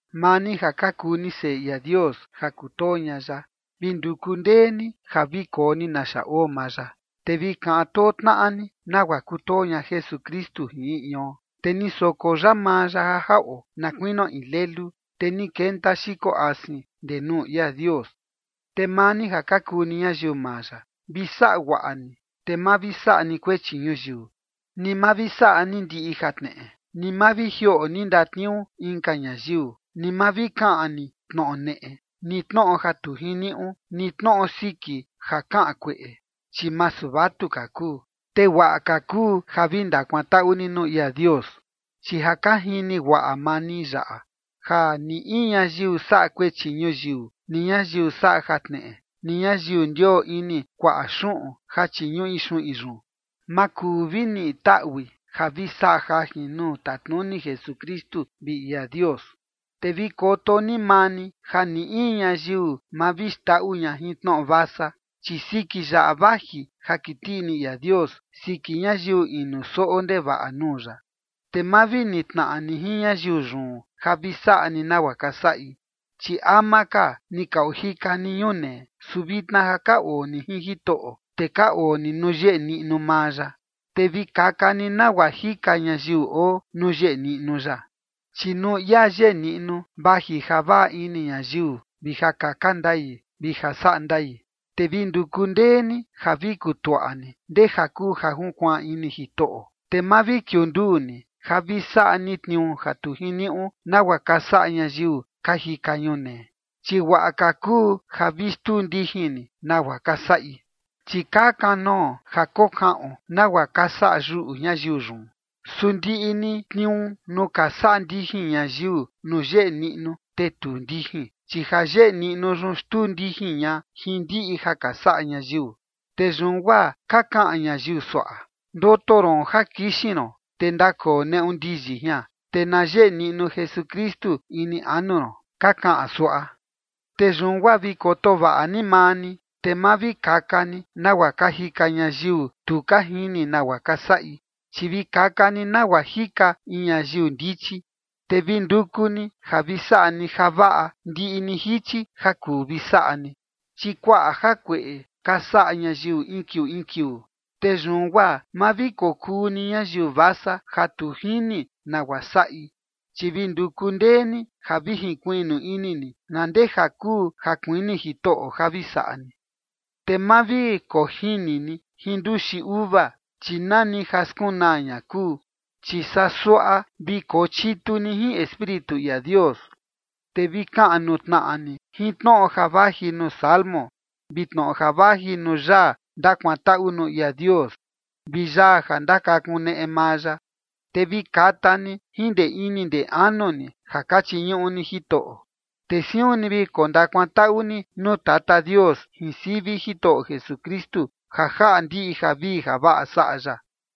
Maa ni ja ka kuu ni seꞌe ia Dios ja kutoo ña ya, vi nduku ndee ni ja vi koo ni naxa oo maa ya. Te vi kaꞌan too tnaꞌa ni, nagua kutoo ña Jesukristu jin in ion, te ni soko ya maa ya ja jaꞌo, na kuinio in lelu, te ni kenta xiko asin ndee nuu ia Dios. Te maa ni ja ka kuu ni ñayiu maa ya, vi saꞌa guaꞌa ni, te ma vi saꞌa ni kuechi ñuyiu, ni ma vi saꞌa ni ndiꞌi jatneꞌe, ni ma vi jioꞌo ni ndatniuu inka ñayiu, ni ma vi kaꞌan ni tnoꞌo neꞌe, ni tnoꞌo ja tu jiniuꞌu, ni tnoꞌo siki ja kaꞌan kueꞌe, chi masu vatuka kuu. Te guaꞌa ka kuu ja vi ndakuantaꞌu ni nuu ia Dios. Chi ja ka jini guaꞌa maa ni yaꞌa: Ja ni in ñayiu saꞌa kuechi ñuyiu, ni ñayiu saꞌa jatneꞌe, ni ñayiu ndioo ini kuaꞌa xuꞌun, ja chiñuꞌi xuꞌin yun, ma kuu vi niꞌi taꞌui ja vi saꞌa jajin nuu tatnuni Jesukristu vi ia Dios. Te vi koto ni maa ni ja ni in ñayiu ma vi xndaꞌu ña jin tnoꞌo vasa, chi siki yaꞌa vaji ja kiti ini ia Dios siki ñayiu inu soꞌo ndevaꞌa nuu ya. Te ma vi nitnaꞌa ni jin ñayiu yun ja vi saꞌa ni nagua ka saꞌi. Chi ama ka ni ka ojika ni ñunee, su vitna ja ka oo ni jin Jitoꞌo, te ka oo ni nuu yeꞌe niꞌnu maa ya, te vi kaka ni nagua jika ñayiu oo nuu yeꞌe niꞌnu ya. Chi nuu ia yeꞌe niꞌnu vaji ja vaꞌa ini ñayiu vi ja kaka ndai vi ja saꞌa ndaꞌi. Te vi nduku ndee ni ja vi kutuaꞌa ni ndeja kuu ja junkuaan ini Jitoꞌo. Te ma vi kiunduu ni ja vi saꞌa ni tniuu ja tu jiniuꞌu, nagua ka saꞌa ñayiu ka jika ñunee, chi guaꞌa ka kuu ja vi xtuu ndijin ni nagua ka saꞌi, chi ka kanoo ja kokaꞌon nagua ka saꞌa yuꞌu ñayiu yun. Su ndiꞌi ni tniuu nuu ka saꞌa ndijin ñayiu nuu yeꞌe niꞌnu, te tuu ndijin, chi ja yeꞌe niꞌnu yun xtuu ndijin ña jin ndiꞌi ja ka saꞌa ñayiu. Te yun guaa ka kaꞌan ñayiu suaꞌa: Ndoto ron ja kixin ron, te ndakoo neꞌu ndiyi jian, te na yeꞌe niꞌnu Jesukristu ini anu ron, ka kaꞌan suaꞌa. Te yun guaa vi koto vaꞌa ni maa ni, te ma vi kaka ni nagua ka jika ñayiu tu ka jini nagua ka saꞌi, chi vi kaka ni nagua jika in ñayiu ndichi. Te vi nduku ni ja vi saꞌa ni javaꞌa ndiꞌi ni jichi ja kuu vi saꞌa ni, chi kuaꞌa jakueꞌe ka saꞌa ñayiu in kiuu in kiuu. Te yun guaa ma vi kokuu ni ñayiu vasa ja tu jini nagua saꞌi, chi vi nduku ndee ni ja vi jinkuiꞌnu ini ni na ndeja kuu ja kuini Jitoꞌo ja vi saꞌa ni. Te ma vi kojini ni jin nduxi uva, chi nani ja skunaa ña kuu, chi saa suaꞌa vi kochitu ni jin Espíritu ia Dios. Te vi kaꞌan nuu tnaꞌa ni jin tnoꞌo ja vaji nuu salmo, vi tnoꞌo ja vaji nuu yaa ndakuantaꞌu nuu ia Dios, vi yaa ja ndakakuneꞌe maa ya, te vi kata ni jin ndee ini ndee anu ni ja ka chiñuꞌu ni Jitoꞌo. Te siun ni vi kondakuantaꞌu ni nuu Tata Dios jin sivi Jitoꞌo Jesukristu, ja jaꞌa ndiꞌi javii javaꞌa saꞌa ya.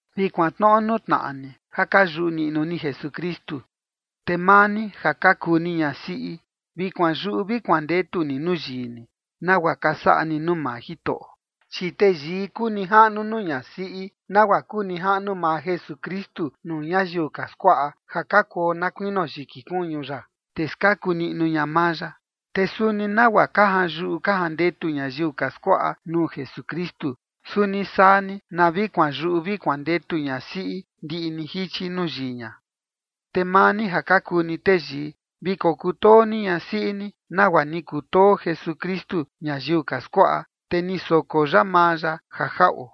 Vi kuantnoꞌo nuu tnaꞌa ni ja ka yuꞌu niꞌnu ni Jesukristu. Te maa ni ja ka kuu ni ñasiꞌi, vi kuanyuꞌu vi kuandetu ni nuu yii ni, nagua ka saꞌa ni nuu maa Jitoꞌo. Chi teyii kuu nijaꞌnu nuu ñasiꞌi, nagua kuu nijaꞌnu maa Jesukristu nuu ñayiu ka skuaꞌa ja ka kuo na kuinio yiki kuñu ya, te skaku niꞌnu ña maa ya. Te suni nagua ka janyuꞌu ka jandetu ñayiu ka skuaꞌa nuu Jesukristu, suni saa ni na vi kuanyuꞌu vi kuandetu ñasiꞌi ndiꞌi ni jichi nuu yii ña. Te maa ni ja ka kuu ni teyii, vi kokutoo ni ñasiꞌi ni, nagua ni kutoo Jesukristu ñayiu ka skuaꞌa, te ni soko ya maa ya ja jaꞌo.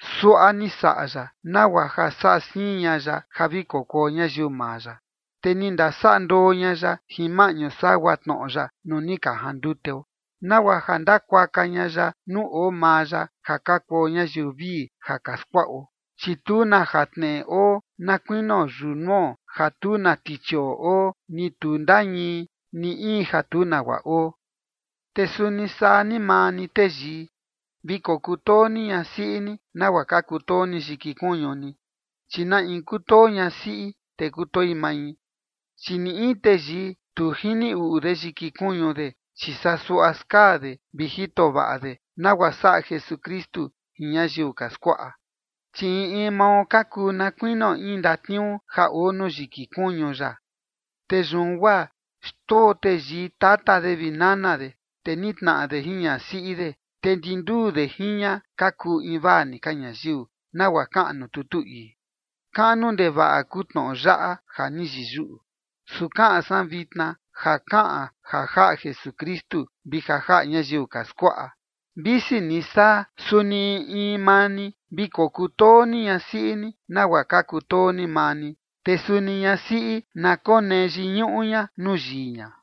Suaꞌa ni saꞌa ya nagua ja saꞌa siin ña ya ja vi kokuo ñayiu maa ya, te ni ndasaꞌa ndoo ña ya jin maꞌñu sagua tnoꞌo ya nuu ni ka janduteo, nagua ja ndakuaka ña ya nuu oo maa ya ja ka kuo ñayiu vii ja ka skuaꞌo, chi tu na jatneꞌe oo, na kuinio yunuo ja tu na tichioꞌo oo, ni tu ndañii, ni in ja tu nagua oo. Te suni saa ni maa ni teyii, vi kokutoo ni ñasiꞌi ni, nagua ka kutoo ni yiki kuñu ni. Chi na in kutoo ñasiꞌi, te kutoi mai. Chi ni in teyii tu jini uꞌu de yiki kuñu de, chi saa suaꞌa skaa de vi jito vaꞌa de, nagua saꞌa Jesukristu jin ñayiu ka skuaꞌa. Chi in in mao ka kuu na kuinio in ndatniuu ja oo nuu yiki kuñu ya. “Te yun guaa xndoo teyii tata de vi nana de, te nitnaꞌa de jin ñasiꞌi de, te ndi nduu de jin ña ka kuu invaa ni ka ñayiu”, nagua kaꞌan nuu tutu ii. Kaꞌnu ndevaꞌa kuu tnoꞌo yaꞌa ja ni yiyuꞌu, su kaꞌan san vitna ja kaꞌan ja jaꞌa Jesukristu vi ja jaꞌa ñayiu ka skuaꞌa. Visi ni saa, suni in in maa ni vi kokutoo ni ñasiꞌi ni nagua ka kutoo ni maa ni. Te suni ñasiꞌi, na konee yiñuꞌu ña nuu yii ña.